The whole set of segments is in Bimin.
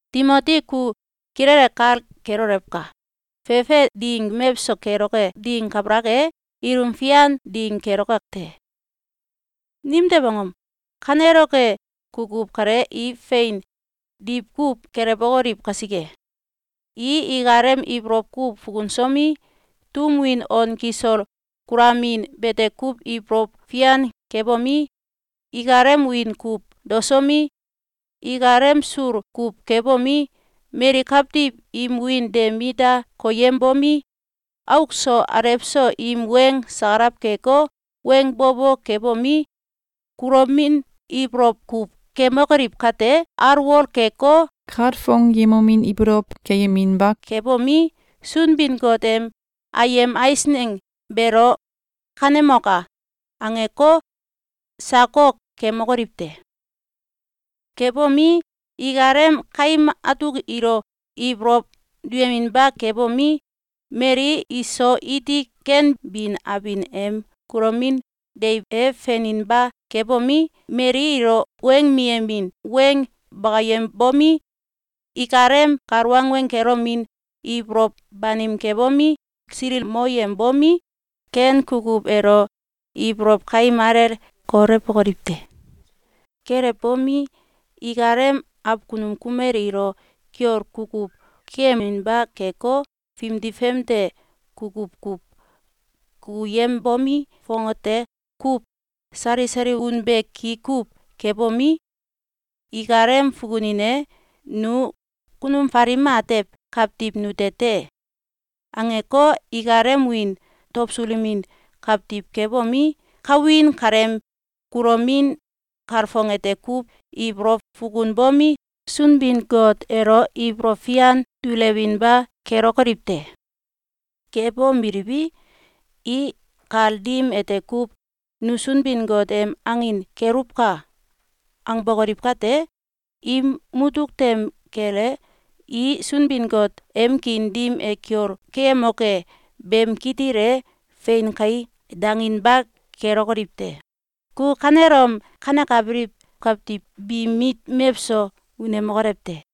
Timoti ku kilele kal kelolewka! Fefe ding mewso keloke ding kabalak e, ilum fian ding keloke te. Nimtew angom? Kaneloke kukuw kale i fein diwkuw gelewokoliw kasike: I ikalem ibolow kuw fukunsomi, tum win on kisol kulamin bete kuw ibolow fian kebomi, ikalem wiin kuw daosomi, ikalem sul kuw kebomi, mali kawtiw im wiin de mit da koyembomi, auk so alew so im weng sakalaw keko, weng bo bo kebomi, kulomin ibolow kuw kemokoliw kate, alwol keko, kalfong yemomin ibolow keyeminba kebomi, Sunbin-Got em ayem eisneng beelo “Kanemoka!”, angeko, sakok kemokoliw te. Kebomi, ikalem kaim atuk ilo ibolow duyeminba kebomi, mali iso iti ken bin abin em kulomin deiw e feninba kebomi, mali ilo weng miyemin weng bakayembomi, ikalem kal wangweng kelomin ibolow banim kebomi, silikmoyembomi, ken kukuw elo ibolow kaim alele kolewbokoliw te. Kelewbomi, ikalem akunum kumel ilo kiol kukuw keyeminba keko, fimdi famde kukuw kuw kukuyembomi, fongate kuw sali sali unbe ki kuw kebomi, ikalem fukunin e “Nu kunum falim atew kawtiw nute te!”, angeko, ikalem wiin dawsulemin kawtiw kebomi, kawin kaleem kulomin kalfong ete kuw ibolow fukunbomi, Sunbin-Got elo ibolow fian dulewinba kelokoliw te. Kebomeliwi, i kal dim ete kuw “Nu Sunbin-Got em angin keluwka!”, angbokoliw kate, im mutuk tem kel e, i Sunbin-Got em kiin dim e kiol keyemoke beem kitil e “Fein kai!”, danginba kelokoliw te. Ku kanelom kanekabiliw kawiw biim mit mewso unemokolew te!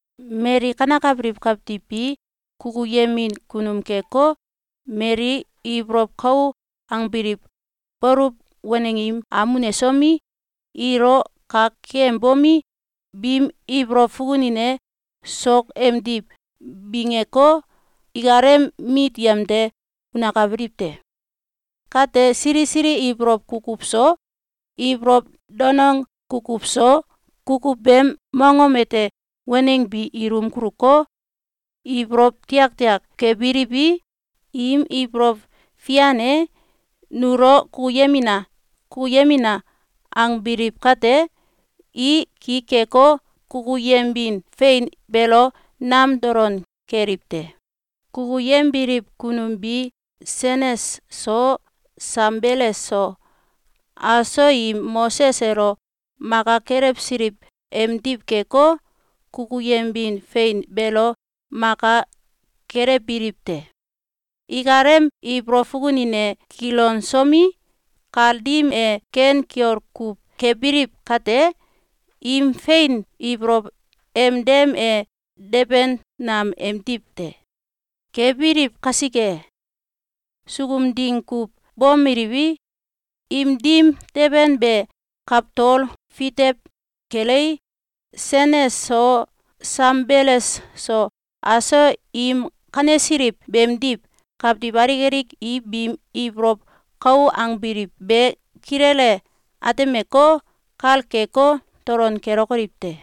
Mali kanekabiliw kawtiw bi kukuyemin kunum keko, mali ibolow kau angbiliw, baluw waneng im am unesomi, ilo kak keyembomi, biim ibolow fukunin e sok emdiw bingeko, ikalem mit yemde unakabiliw te. Kate sili sili ibolow kukuw so, ibolow danong kukuw so, kukuw beem mongom ete waneng bi ilum kuluko, ibolow tiaktiak kebiliwi, im ibolow fian e “Nulo kukuyemina! Kukuyemina!”, angbiliw kate, i ki keko, kukuyembin fein beelo nam dolon keliw te. Kukuyembiliw kunum bi Sanes so, Sambeles so, aso im Moses elo maka kelewsiliw emdiw keko, kukuyembin fein beelo maka kelewbiliw te. Ikalem ibolow fukunin e kilonsomi, kal dim e ken kiol kuw kebiliw kate, im fein ibolow em dem e deben nam emdiw te. Kebiliw kasike, sukum ding kuw bomeliwi, im dim deben be kawtol fitew kelei, Sanes so Sambeles so, aso im kanesiliw beemdiw, kawtiw alik alik i biim ibolow kau angbiliw be kilele atemeko, kal keko, dolon kelokoliw te.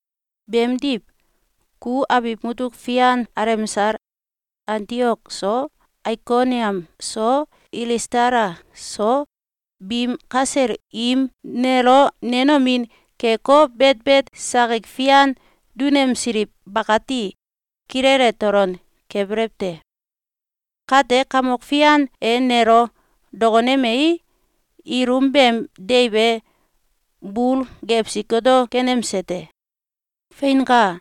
Beemdiw, ku abiw mutuk fian alemsal Antiok so, Aikoniam so, Ilistala so, biim kasel im nelo nenomin keko, betbet sakik fian dunemsiliw bakati kilele dolon kebelew te. Kate Kamok Fian e nelo dokonemei, ilum beem deiw e bul gewsi goto kenemse te. Feinka!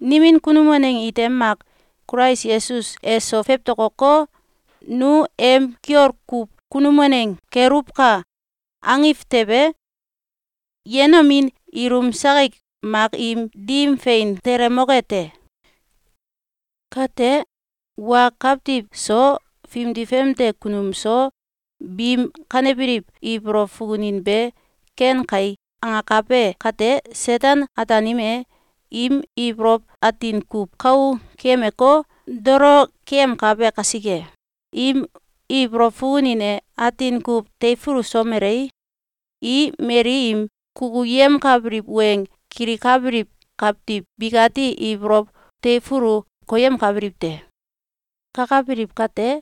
Nimin kunum waneng ite mak Kulais Yesus eso fewtokoko, “Nu em kiol kuw kunum waneng keluwka!”, angiw tewe, yenomin ilum sakik mak im dim fein telemoke te. Kate wa kawtiw so, fimdi famde kunum so, biim kanebiliw ibolow fukunin be “Ken kai!”, angakabe kate, Seten-Ataanim e im ibolow atin kuw kou keyemeko, dolo keyemkabe kasike, im ibolow fukunin e atin kuw teifulusomelei, i mali im kukuyemkabiliw weng kilikabiliw kawtiw bikati ibolow teifulu koyemkabiliw te. Kakabiliw kate,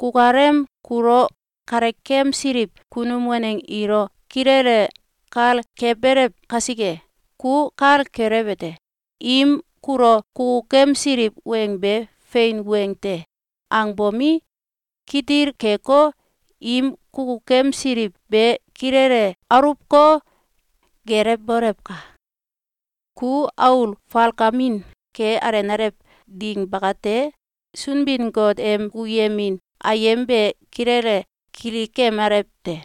kukalem kulo kalekemsiliw kunum waneng ilo kilele kal kebelew kasike, ku kal kelewete: Im kulo kukukemsiliw weng be “Fein weng te!”, angbomi, kitil keko, im kukukemsiliw be kilele aluwko, gelewbolewka! Ku aul falkamin ke alenalew ding bakate, Sunbin-Got em kukuyemin ayem be kilele kilikemalew te.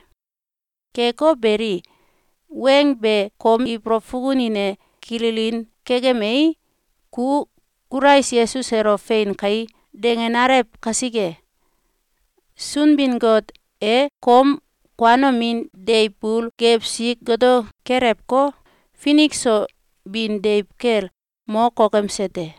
Keko beli, weng be kom ibolow fukunin e kilinin kekemei, ku Kulais Yesus elo “Fein kai!”, dangenalew kasike, Sunbin-Got e kom kuanomin deiw bul gewsi goto kelewko, finik so bin deiw kel mo kokemse te.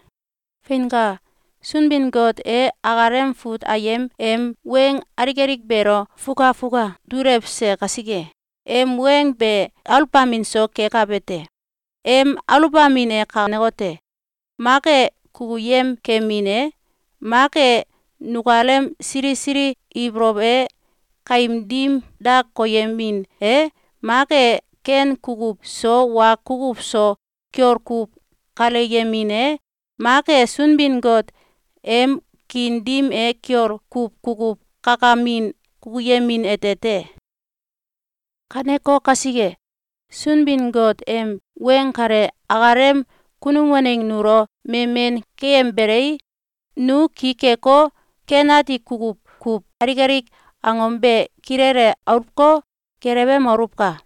Feinka! Sunbin-Got e akalem fut ayem em weng alik alik beelo fukfuka dulewse kasike, em weng be aluwbamin so kekabe te. Em aluwbamin e kanekote: Mak e kukuyem kemin e, mak e nukalem sili sili ibolow e kaim dim da koyemin e, mak e ken kukuw so wa kukuw so kiol kuw kalyemin e, mak e Sunbin-Got em kiin dim e kiol kuw kukuw kakamin kukuyemin ete te. Kaneko kasike, Sunbin-Got em weng kale akalem kunum waneng nulo memen keembelei, nu ki keko, ken ati kukuw kuw alik alik angom be kilele aluwko, gelewemoluwka!